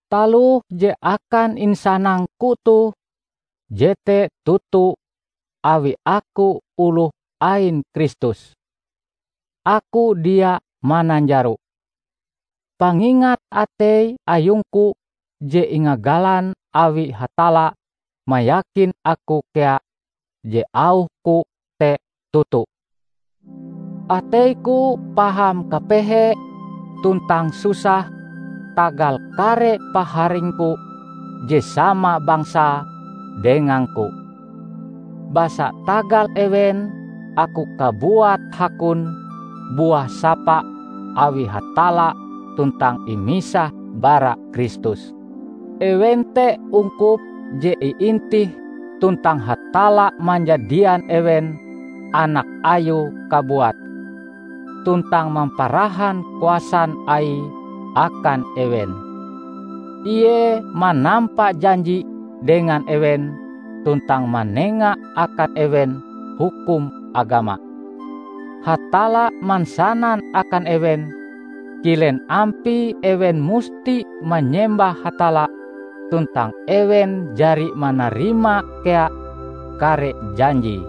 Taloh je akan insanangku toh jete toto awi aku oloh ain Kristus. Aku dia mananjaro. Pangingat atei ayungku je ingagalan awi Hatalla mayakin aku kea je auhku te toto. Ateiku paham kapehe tuntang susah tagal kare paharingku je sama bangsae dengangku. Basa tagal ewen, aku kabuat hakon buah sapa awi Hatalla tuntang imisah bara Kristus. Ewen te ungkup je iintih tuntang Hatalla manjadian ewen anak Ayue kabuat, tuntang mamparahan kuasan Aie akan ewen. Ie manampa janji dengan ewen tuntang manenga akan ewen hukum agama. Hatalla mansanan akan ewen kilen ampie ewen musti manyembah Hatalla tuntang ewen jari manarima kea kare janjie.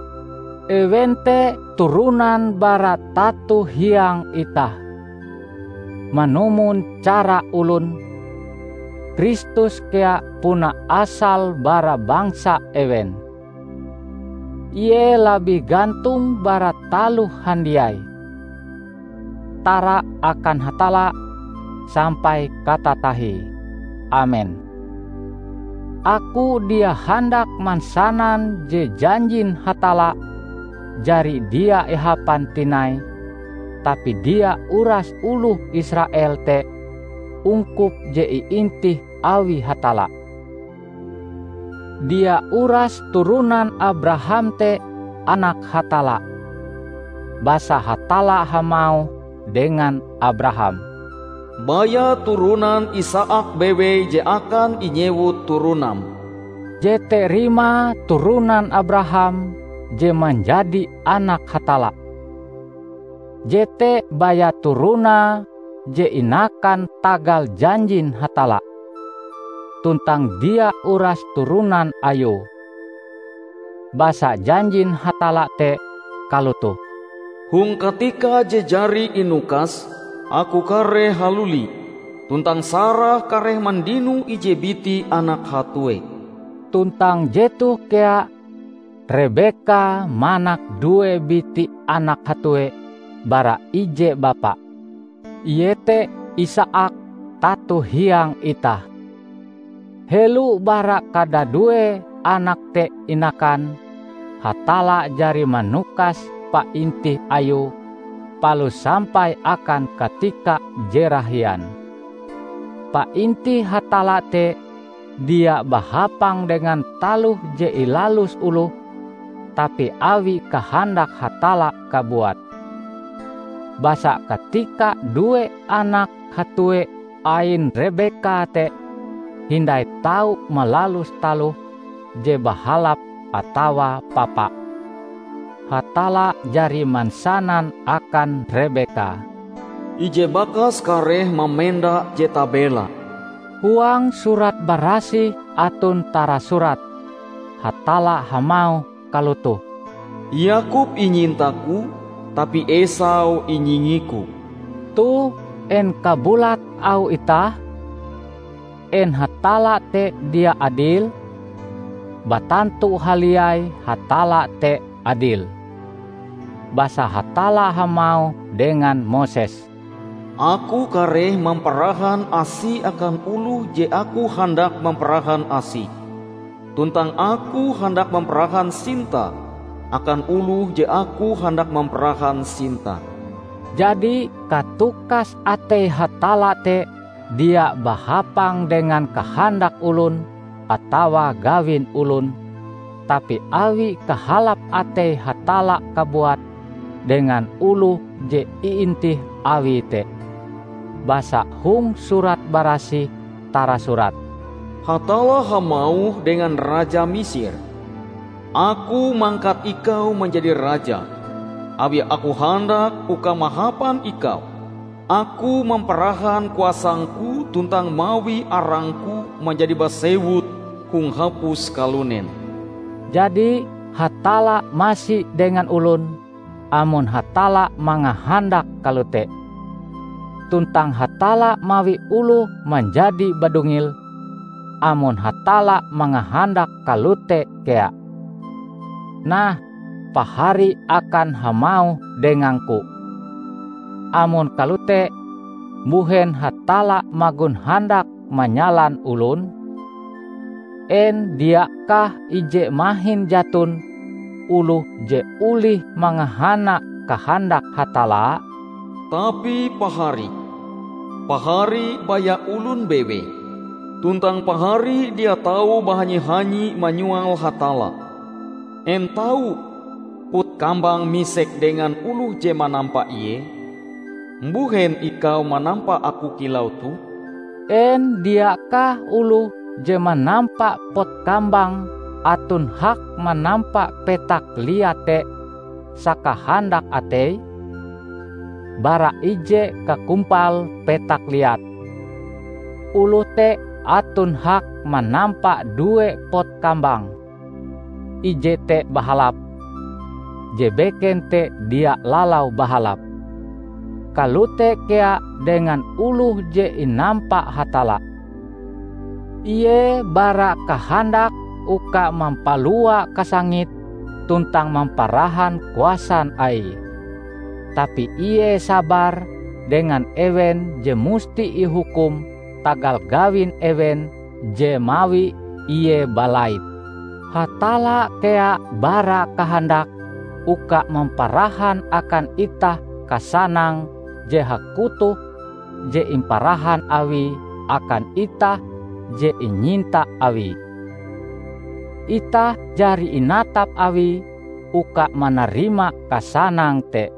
Ewen te turonan bara tato hiang itah. Manumon cara olon, Kristus kea puna asale bara bangsa ewen. Ie labih gantong bara taloh handiai. Tara akan Hatalla sampai katatahie! Amen. Aku dia handak mansanan je janjin Hatalla jari dia ihapan tinai tapi dia urase oloh Israel te ungkup je iintih awi Hatalla. Dia urase turonan Abraham te anak Hatalla. Basa Hatalla hamauh dengan Abraham, "Baya turonan Isaak bewei je akan inyewut turonam." Jete rimae turonan Abraham je manjadi anak Hatalla, jete baya turonae je inakan tagal janjin Hatalla; tuntang dia uras turonan ayue. Basa janjin Hatalla te kalotoh, "Hong katika je jari inukas, Aku kareh haluli, tuntang Sarah kareh mandino ije biti anak hatue." Tuntang jetoh kea: Rebeka manak due biti anak hatue bara ije bapa, iete Isaak tato hiang itah. Helo bara kadadue anak te inakan, Hatalla jari manukas paintih Ayue palus sampai akan katika je rahian. Paintih Hatalla te dia bahapang dengan taloh je ilalus oloh, tapi awi kahandak Hatalla kabuat. Basa katika due anak hatue ain Rebeka te hindai tau malalus taloh je bahalap atawa papa, Hatalla jari mansanan akan Rebeka, "Ije bakas kareh mamenda je tabela." Huang Surat Barasih aton tarasurat, Hatalla hamauh kalotoh, "Yakob inyintaku, tapi Esau inyingiku." Toh, en kabulat auh itah? En Hatalla te dia adil? Batantu haliai Hatalla te adil. Basa Hatalla hamauh dengan Moses, "Aku kareh mamparahan asi akan oloh je Aku handak mamparahan asi, tuntang Aku handak mamparahan sinta akan oloh je Aku handak mamparahan sinta." Jadi katukas atei Hatalla te dia bahapang dengan kahandak olon atawa gawin olon, tapi awi kahalap atei Hatalla kabuat dengan oloh je iintih Awie te. Basa hong Surat Barasih tarasurat, "Hatalla hamauh dengan Raja Misir, 'Aku mangkat ikau manjadi raja, awi Aku handak, uka mahapan ikau, Aku mamparahan kuasang-Ku tuntang mawi arang-Ku manjadi basewut hong hapus kalunen.' " Jadi Hatalla masi dengan olon amon Hatalla mangahandak kalote. Tuntang Hatalla mawi oloh manjadi badungil, amon Hatalla mangahandak kalote kea. Nah, Pahari akan hamauh dengangku. "Amon kalote, mbuhen Hatalla magon handak manyalan olon? En diakah ije mahin jaton oloh je olih mangahana kahandak Hatalla?" Tapi, Pahari! Pahari baya olon bewei. Tuntang pahari dia tau bahanyi-hanyi manyoal Hatalla! En tau pot kambang misek dengan oloh je manampa ie, "Mbuhen ikau manampa aku kilau toh?" En diakah oloh je manampa pot kambang aton hak manampa petak liat te sakahandak ateie? Bara ije kakumpal petak liat, oloh te aton hak manampa due pot kambang: ije te bahalap, je beken te dia lalau bahalap. Kalote kea dengan oloh je inampa Hatalla. Ie bara kahandak uka mampalua kasangite tuntang mamparahan kuasan Aie. Tapi ie sabar dengan ewen je musti ihukum tagal gawin ewen je mawi ie balait. Hatalla kea bara kahandak uka mamparahan akan itah kasanang je hakutoh je imparahan Awie akan itah je inyinta Awie. Itah jari inatap Awie uka manarima kasanang te.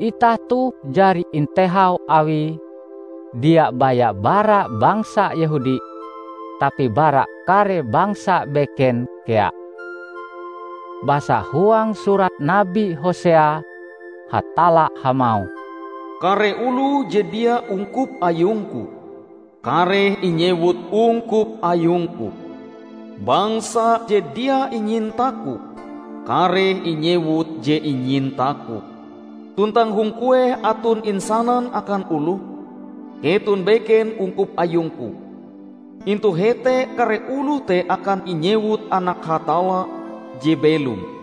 Itah toh jari intehau Awie, dia baya bara bangsa Yehudi, tapi bara kare bangsa beken kea. Basa huang surat Nabi Hosea, Hatalla hamauh, "Kare oloh je dia ungkup ayung-Ku, kareh inyewut 'Ungkup ayung-Ku'. Bangsa je dia inyinta-Ku, kareh inyewut 'Je inyinta-Ku'. Tuntang hong kueh aton insanan akan oloh, 'Keton beken ungkup ayung-Ku,' Intu hete kare oloh te akan inyewut anak Hatalla je belom."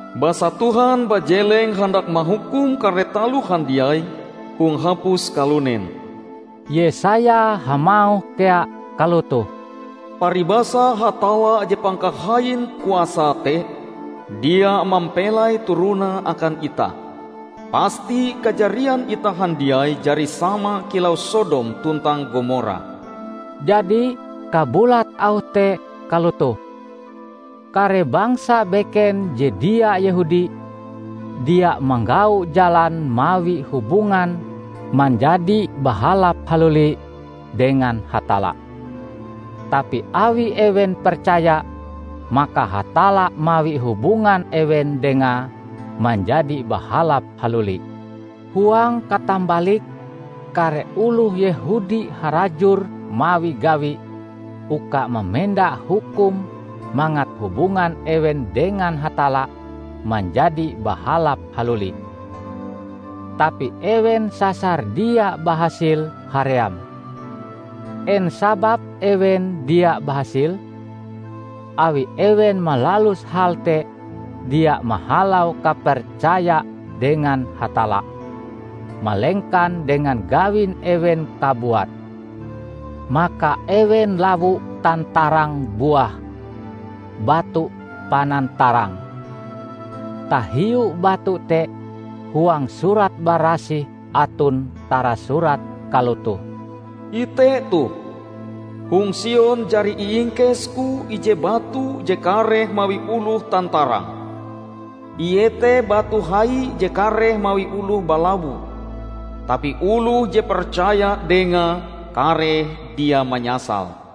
Basa Tuhan bajeleng handak mahukum kare taloh handiai hong hapus kalunen." Yesaya hamauh kea kalotoh, "Paribasa Hatalla je Pangkahain Kuasae te dia mampelai turonae akan itah, pasti kajarian itah handiai jari sama kilau Sodom tuntang Gomora." Jadi, kabulat auh te kalotoh: kare bangsa beken je dia Yehudi: dia manggau jalan mawi hubungan manjadi bahalap haluli dengan Hatalla. Tapi awi ewen percaya, maka Hatalla mawi hubungan ewen Dengae manjadi bahalap haluli. Huang katambalike, kare oloh Yehudi harajur mawi gawi uka mamenda hukum mangat hubungan ewen dengan Hatalla manjadi bahalap haluli. Tapi ewen sasar dia bahasil haream. En sababe ewen dia bahasil? Awi ewen malalus hal te dia mahalau kapercaya dengan Hatalla, malengkan dengan gawin ewen kabuat. Maka ewen lawo tantarang buah "Batu Panantarang". Tahiu batu te huang Surat barasih aton tarasurat kalotoh, "Ite toh: Hong Sion jari iingkes-Ku ije batu je kareh mawi oloh tantarang; ie te batu hai je kareh mawi oloh balawo; Tapi oloh je percaya Dengae kareh dia manyasal."